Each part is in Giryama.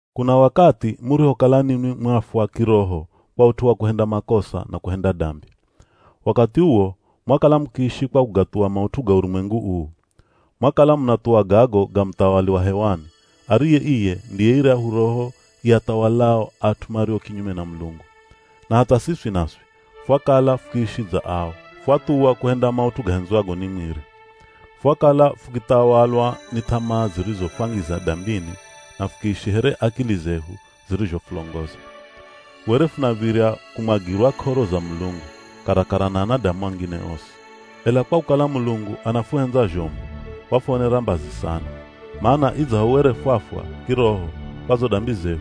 Kuna wakathi murihokala ninwi mwafwa kiroho kwa ut'u wa kuhenda makosa na kuhenda dambi. Wakathi uwo mwakala mukiishi kwa kugathuwa maut'u ga urumwengu uu. Mwakala munathuwa gago ga muthawali wa hewani, ariye iye ndiye iryahu roho iathawalao at'u mario kinyume na Mulungu. Na hatha siswi naswi, fwakala fukiishi dza ao. Fwathuwa kuhenda maut'u gahendzwago ni mwiri. Fwakala fukithawalwa ni th'amaa zirizofwangiza dambini na fukiishi here akili zehu zirizhofulongoza. Were funav̱irya kumwagirwa k'oro za Mulungu, karakara na anadamu angine osi. Ela kwa kukala Mulungu anafuhendza zhomu, wafuonera mbazi sana, mana idzaho were fwafwa kiroho kwa zo dambi zehu,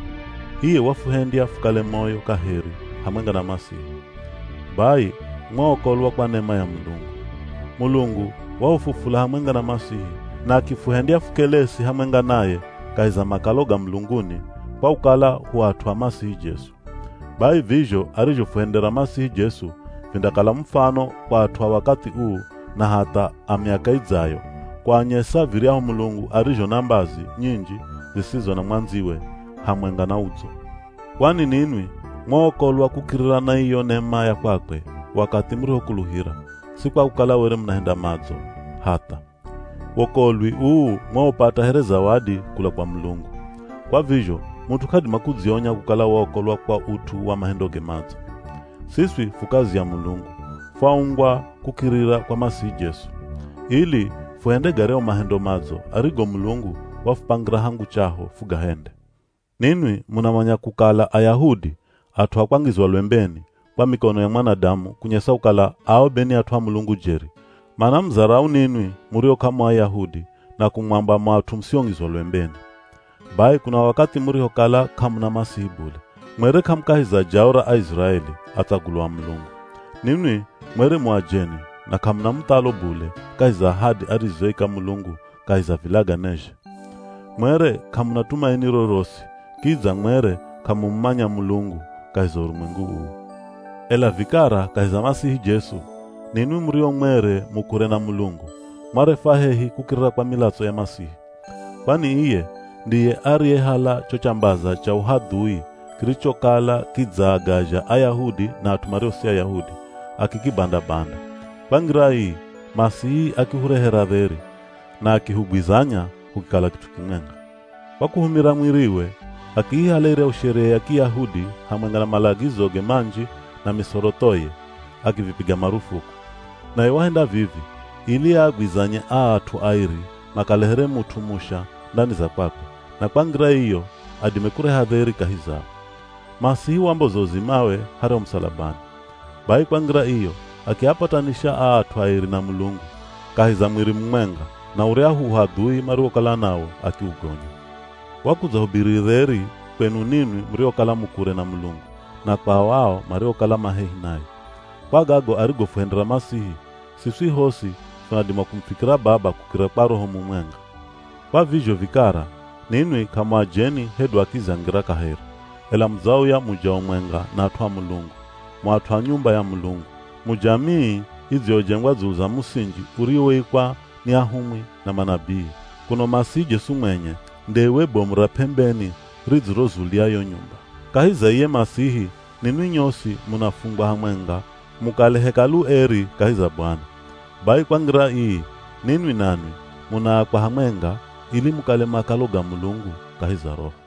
iye wafuhendya fukale moyo kaheri hamwenga na Masihi. Bai mwaokolwa kwa nema ya Mulungu. Mulungu wahufufula hamwenga na Masihi na akifuhendya fukelesi hamwenga naye kahi za makalo ga mulunguni kwa kukala hu at'u a Masihi Jesu. Bai vizho arizhofuhendera Masihi Jesu vindakala mufano kwa at'u a wakathi uu na hatha a miaka idzayo, kuanyesa viryahu Mulungu arizho na mbazi nyinji zisizo na mwandziwe, hamwenga na udzo. Kwani ninwi mwaokolwa kukirira na iyo nema ya kwakwe wakathi murihokuluhira, si kwa kukala were munahenda madzo, hatha. Wokolwi uu mwaupata here zawadi kula kwa Mulungu. Kwa vizho mut'u k'adima kudzionya kukala waokolwa kwa ut'u wa mahendoge madzo. Siswi fu kazi ya Mulungu, faumbwa kukirira kwa Masihi Jesu, ili fuhende garyahu mahendo madzo arigo Mulungu wafupangira hangu chaho fugahende. Ninwi munamanya kukala Ayahudi, at'u a kwangizwa lwembeni kwa mikono ya mwanadamu kunyesa kukala ao be ni at'u a Mulungu jeri, manamuzarau ninwi murio k'amu Ayahudi na kumwamba mu at'u musiongizwa lwembeni. Bai kuna wakathi murihokala k'amuna Masihi bule, mwere k'amu kahi za jao ra Aiziraeli, atsagulwa a Mulungu. Ninwi mwere mu ajeni na k'amuna muthalo bule kahi za ahadi arizoika Mulungu kahi za vilaganezhe. Mwere k'amuna tumaini rorosi, kidza mwere k'amumumanya Mulungu kahi za urumwengu uu. Ela vikara kahi za Masihi Jesu, ninwi murio mwere mu kure na Mulungu, mwarefwa hehi kukirira kwa milatso ya Masihi. Kwani iye ndiye ariyehala cho chambaza cha uhadhui kirichokala kidzaagazha Ayahudi na at'u mario si Ayahudi, akikibanda-banda. Kwa ngira ii Masihi akihurehera dheri, na akihugwizanya hukikala kit'u kimwenga. Kwa kuhumira mwiriwe, akiihala iryahu Sheria ya Kiyahudi hamwenga na malagizoge manji na misorothoye, akivipiga marufuku. Naye wahenda vivi ili aagwizanye aa at'u airi makale here mut'u musha ndani za kwakwe, na kwa ngira iyo adime kureha dheri kahi zao. Masihi wamboza uzimawe haryahu musalabani. Bai kwa ngira iyo akiapatanisha aa at'u airi na Mulungu, kahi za mwiri mumwenga, na uryahu uhadhui mariwokala nawo akiugonya. Wakudzahubiri dheri kwenu ninwi muriokala mu kure na Mulungu, na kwao ao mariokala ma hehi naye. Kwa gago arigofuhendera Masihi, siswi hosi funadima kumufikira Baba kukirira kwa Roho mumwenga. Kwa vizho vikara, ninwi k'amu ajeni hedu akizi a ngira kaheri, ela mudzauya mu jao mwenga na at'u a Mulungu, mu at'u a nyumba ya Mulungu. Mu jamii idziyojengwa dzulu za musinji uriwoikwa ni ahumwi na manabii, kuno Masihi Jesu mwenye nde iwe bomu ra p'embeni ridzirozulia yo nyumba. Kahi za iye Masihi ninwi nyosi munafungwa hamwenga mukale Hekalu eri kahi za Bwana. Bai kwa ngira ii, ninwi nanwi munaakwa hamwenga ili mukale makalo ga Mulungu kahi za Roho.